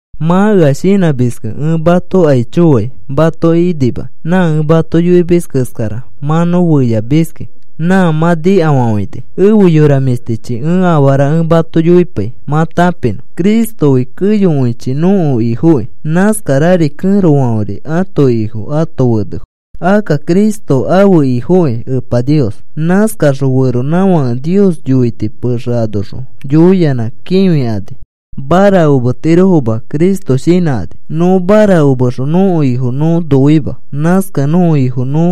Mã ea shinãmiskẽ ẽ mato aicho fai matoki inimakĩ. Nã ẽ mato yoimis keskara mã nõ feyafamiski. Nã mã nikafafãini. Efe yora mĩshtichi, ẽ afara ẽ mato yoipai mã tãpinõ. Cristofi keyokõichi nõko Ifokĩ. Nãskarari kẽrofãfe ãto ifo ãto fenefo. Akka Cristo ãfe Ifokĩ Epa Nios. Nãskakaxõ feronãfake Nios yoiti pexe anoxõ yoiyanã kĩfikani marakometirofoma Cristo shinãkani. Nõ marakomexõ nõko Ifo nõ noima. Nãskakẽ nõko Ifo nõ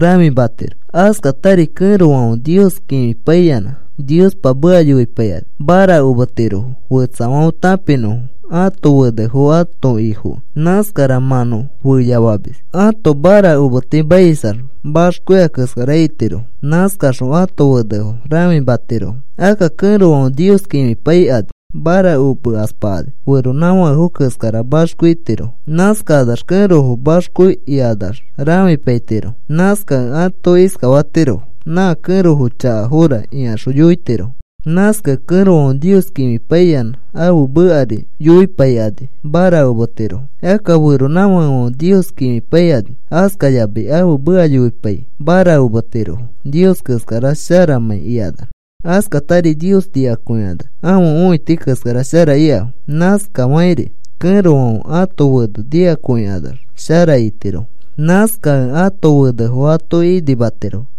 rãfimatiro. Askatari kẽrofãfe Nios kĩfipaiyanã Niospa meka yoipaikani marakometirofo fetsafãfe tãpinõfo ãto fenefo ãto ifokẽ. Nãskara mã nõ feyafamis. Ãto marakometimaisax maxko ika keskara itirofo. Nãskaxõ ãto fenefo rãfimatirofo. Akka kẽrofãfe Nios kĩfipaikani marakomekaspakani feronãfakefo keskara maxko itiro. Nãskakanax kẽrofo maxko ikanax rãfipaitirofo. Nãskakẽ ato iskafatirofo: “Nã kẽrofo chakafora,” ikaxõ yoitirofo. Nãskakẽ kẽrofãfe Nios kĩfipaiyanã ãfe mekari yoipaikani marakometirofo. Akka feronãfakefãfe Nios kĩfipaikani askayamai ãfe meka yoipai marakometirofoma Nios keskara sharamãi ikanax. Askatari Nios nikakõikanax ãfe õiti keskara shara ikafo. Nãskafakĩri kẽrofãfe ãto fene nikakõikanax shara itirofo. Nãskakẽ ãto fenefo atoki inimatirofo.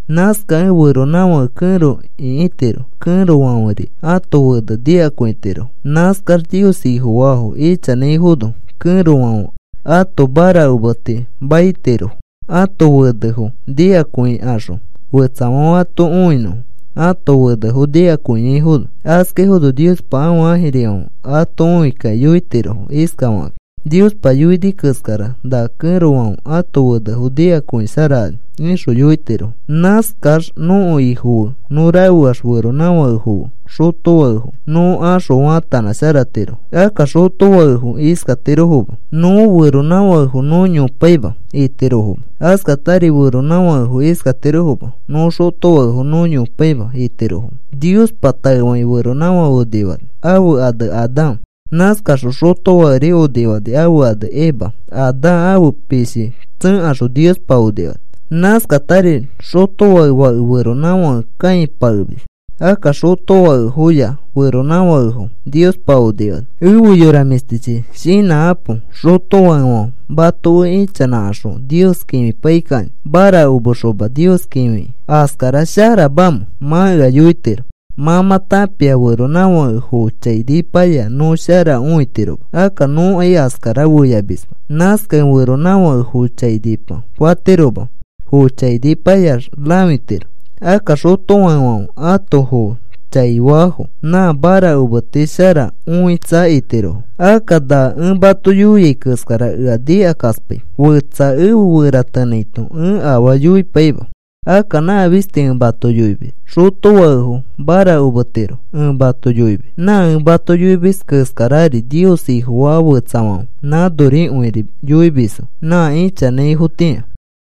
Nãskakẽ feronãfãke kẽro ĩkitiro. Kẽrofãferi ãto fene nikakõitirofo. Nãskax Nios Ifofaafo ichanãifono kẽrofãfe ãto marakometi maitirofo ãto fenefo nikakõikaxõ fetsafãfe ato õinõfo ãto fenefo nikakõiaifono. Askaifono Niospa ãfe ãjirifãfe ato õikakĩ yoitirofo iskafakakĩ: “Niospa yoini keskara na kẽrofãfe ãto fenefo nikakõisharakani,” ixõ yoitirofo. Nãskax nõko Ifo fe nõ rafeax feronãfakefo fe xotofakefo nõ axõ faatanãsharatirofo. Akka xotofakefo iskatirofoma: “Nõ feronãfakefo nõ yopaima,” itirofoma. Askatari feronãfakefo iskatirofoma: “Nõ xotofakefo nõ yopaima,” itirofoma. Niospa taefakĩ feronãfake onifani, ãfe ane Adán. Nãskaxõ xotofakeri onifani, ãfe ane Eva. Adán ãfe pishi tsẽkaxõ Niospa onifani. Nãskatari xotofake fake feronãfake kãipakemis. Akka xotofakefoya feronãfakefo Niospa onifani. Efe yora mĩshtichi, shinãkãpo. Xotofakefãfe mato fe ichanãkaxõ Nios kĩfipaikakĩ marakomexoma Nios kĩfikĩ, ¿askara sharamamẽ? Mã ea yoitiro. Mã mã tãpia feronãfake foo chainipaya nõ shara õitiroma. Akka nõkai askara feyafamisma. Nãskakẽ feronãfãke foo chainipa fatiroma. Foo chainipayax rãfitiro. Akka xotofakefãfe ãto foo chai faafo nã marakometi shara õitsa itirofo. Akka na ẽ mato yoiai keskara ea nikakaspai fetsa efe feratenãito ẽ afaa yoipaima. Akka nã fisti ẽ mato yoimis. Xotofakefo marakometiro ẽ mato yoimis. Nã ẽ mato yoimis keskarari Nios Ifofaa fetsafãfe nãnorikõiri yoimisfo nã ichanãifotĩa.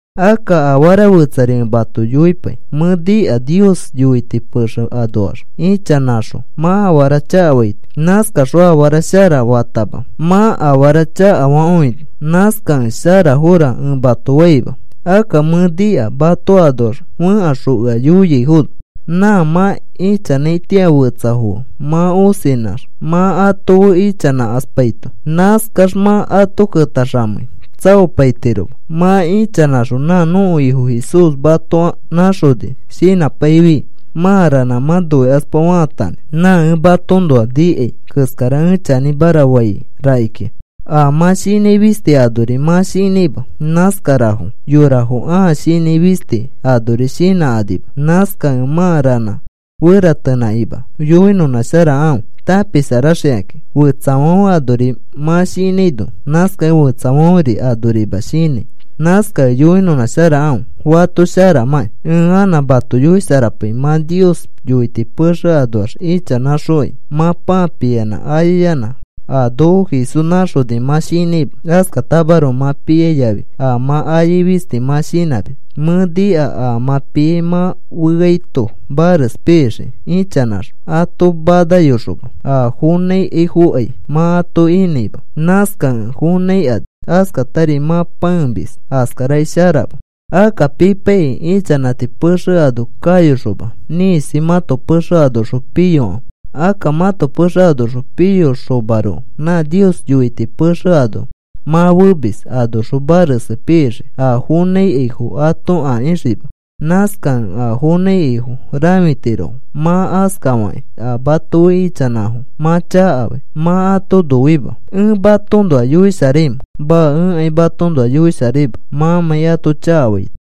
Akka afara fetsari ẽ mato yoipai. Mẽ nika Nios yoiti pexe anoax ichanãxõ mã afara chakafaito. Nãskaxõ afara shara fatama mã afara chakafakõini. Nãskakẽ, sharafora ẽ mato faima. Akka mẽ nika mato anoax fẽkaxõ ea yoiaifono nã mã ichanãitĩa fetsafo fe mã osinãxma ato fe ichanãkaspaito. Nãskax mã ato ketaxamei tsaopaitiroma. Mã ichanãxõ nã nõko Ifo Jesús mato nãxoni shinãpaifi mã ranã mã noikaspa faatanãi. Nã ẽ matoõnoa nikai keskara ẽ chanĩmara fai rakikĩa. A mã shinãi fisti anori mã shinãima. Nãskarafo yorafo a shinãi fisti anori shinãkanima. Nãskakẽ mã ranã feratenãkakĩma yoinãnãsharakãfe tãpisharaxikakĩ. Fetsafãfe anori mã shinãino, nãskakẽ fetsafãferi anorima shinãi. Nãskakẽ yoinãsharakãfe fato sharamãkĩ. Ẽ anã mato yoisharapai. Mã Nios yoiti pexe anoax ichanãxokai mã pãa piyanã ayayanã a noko Jesús nãxoni mã shinãima. Askatamaroko mã piai yafi a mã ayai fisti mã shinãmis. Mẽ nika a mã piai mã feaito mares pixikĩ ichanãxõ ato manayoxoma. A fonãikaifokai mã ato inãima. Nãskakẽ fonãikani. Askatari mã pãemis. Askarakai sharama. Akka pipaikĩ ichanãti pexe ano kayoxoma ĩkisi mãto pexe anoxõ piyokãfe. Akka mãto pexe anoxõ piyoxomaroko nã Nios yoiti pexe ano mã femis anoxõ mares pixikĩ a fonãikaifo ato akĩxikima. Nãskakẽ a fonãikaifo rãfitirofo. Mã askafakĩ a mato fe ichanãfo mã chakafai. Mã ato noima. ¿Ẽ matoõnoa yoisharaimẽ? Maa. Ẽkai matoõnoa yoisharaima mãmãi ato chakafaito.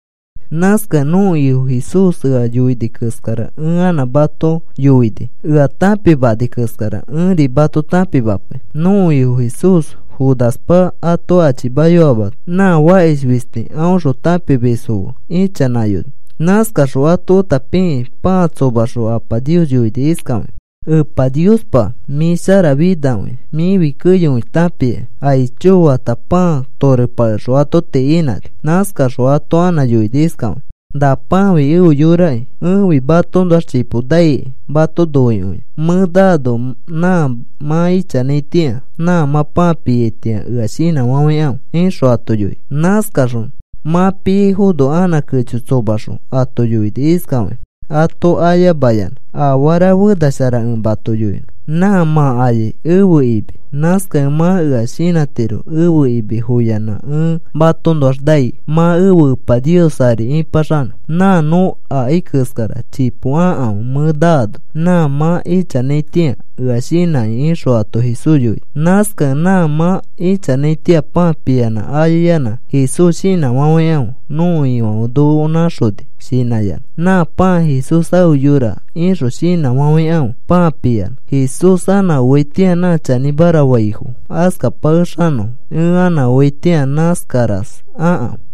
Nãskakẽ nõko Ifo Jesús ea yoini keskara ẽ anã mato yoini. Ea tãpimani keskara ẽri mato tãpimapai. Nõko Ifo Jesús Judaspa ato achimayoamano nã fakish fisti aõxõ tãpimisfo fe ichanãyoni. Nãskaxõ ato feta pikĩ pãa tsomaxõ Apa Nios yoini iskafakĩ: “Epa Niospa, mĩ sharafinakõia. Mĩfi keyokõi tãpiaki. Aicho,” fata pãa torepakexõ ato tii inãni. Nãskaxõ ato anã yoini iskafakĩ: “Na pãafi ẽfe yoraki. Ẽfi matoõnoax chipo naikai mato noikõiax. Mẽ naano nã mã ichanãitĩa nã mã pãa piaitĩa ea shinãfafãikãfe,” ixõ ato yoini. Nãskaxõ mã piaifono anã kecho tsomaxõ ato yoini iskafakĩ ato ayamayanã: “Afara fena shara ẽ mato yoinõ. Nã mã ayai ẽfe imi. Nãskakẽ mã ea shinãtiro. Ẽfe imi foyanã ẽ matoõnoax nai mã efe Epa Nios ari ĩpaxanõ. Nã nõ akai keskara chipo akãfe mẽ naano nã mã ichanãitĩa ea shinãkĩ,” ixõ ato Jesús yoini. Nãskakẽ nã mã ichanãitĩa pãa piyanã ayayanã Jesús shinãfafãikãfe: “Nõko Ifãfe noko nãxoni,” shinãyanã. “Nã pãa Jesús ãfe yora,” ixõ shinãfafãikãfe pãa piyanã. Jesús anã oaitĩa nã chanĩmara faifo askapakexanõfo. Ẽ anã oaitĩa nãskaras akãfe.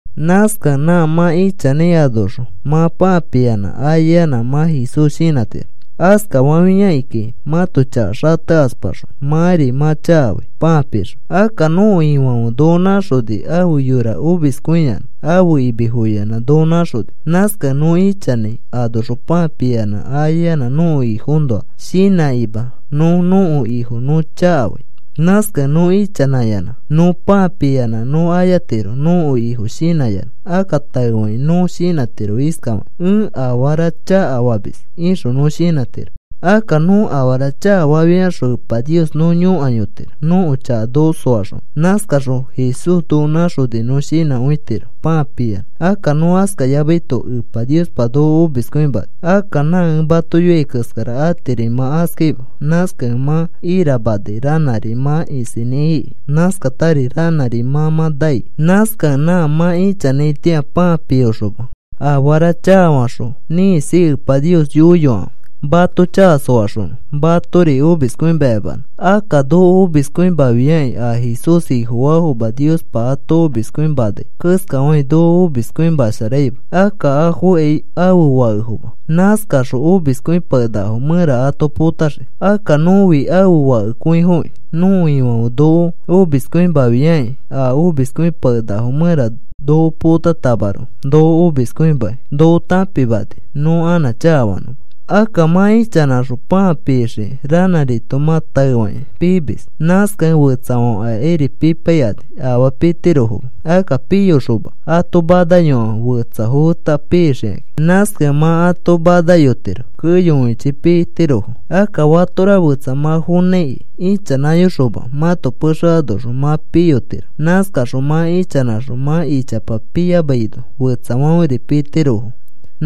Nãskakẽ nã mã ichanãi anoxõ mã pãa piyanã ayayanã mã Jesús shinãtiro. Askafafiakĩkai mãto chaka xatekaspaxõ mãri mã chakafai pãa pixõ. Akka nõko Ifãfe noko nãxoni ãfe yora omiskõiyanã ãfe imi foyanã noko nãxoni. Nãskakẽ nõ ichanãi anoxõ pãa piyanã ayayanã nõko Ifoõnoa shinãkima nõ nõko Ifo nõ chakafai. Nãskakẽ nõ ichanãyanã nõ pãa piyanã nõ ayatiro nõko Ifo shinãyanã. Akka taefakĩ nõ shinãtiro iskafakĩ: “Ẽ afara chakafamis,” ixõ nõ shinãtiro. Akka nõ afara chakafafiaxõ Epa Nios nõ yõkayotiro nõko chaka noko soaxonõ. Nãskaxõ Jesús noko nãxoni nõ shinãkõitiro pãa piyanã. Akka nõ askafayamaito Epa Niospa noko omiskõimani. Akka nã ẽ mato yoiai keskara atiri mã askaima. Nãskakẽ mã iramanai. Ranãri mã isinĩ iki. Nãskatari ranãri mã mã nai. Nãskakẽ nã mã ichanãitĩa pãa piyoxoma afara chakafaxõ ĩkisi Epa Nios yoiyokãfe mato chaka soaxonõ matori omiskõimayamanõ. Akka noko omiskõimafiakĩ a Jesús Ifofaafoma Niospa ato omiskõimanai keskafakĩ noko omiskõimasharaima. Akka afokai ãfe fakefoma. Nãskaxõ omiskõipakenakafo mẽra ato potaxii. Akka nõfi ãfe fakekõifokĩ. Nõko Ifãfe noko omiskõimafiakĩ a omiskõipakenakafo mẽra noko potatamaroko noko omiskõimakĩ noko tãpimani nõ anã chakafanõma. Akka mã ichanãxõ pãa pixikĩ ranãrito mã taefakĩ piimis. Nãskakẽ fetsafãfe akairi pipaikani afaa pitirofoma. Akka piyoxoma ato manayokãfe fetsafo feta pixikakĩ. Nãskakẽ mã ato manayotiro keyokõichi pitirofo. Akka fatora fetsa mã fonãiki ichanãyoxoma mãto pexe anoxõ mã piyotiro. Nãskaxõ mã ichanãxõ mã ichapa piyamaino fetsafãferi pitirofo.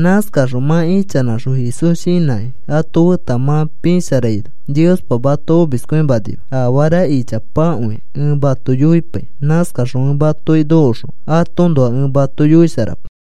Nãskaxõ mã ichanãxõ Jesús shinãkĩ ato feta mã pisharaino Niospa mato omiskõimanima. Afara ichapakõi ẽ mato yoipai. Nãskaxõ ẽ matoki nokoxõ atoõnoa ẽ mato yoisharapai.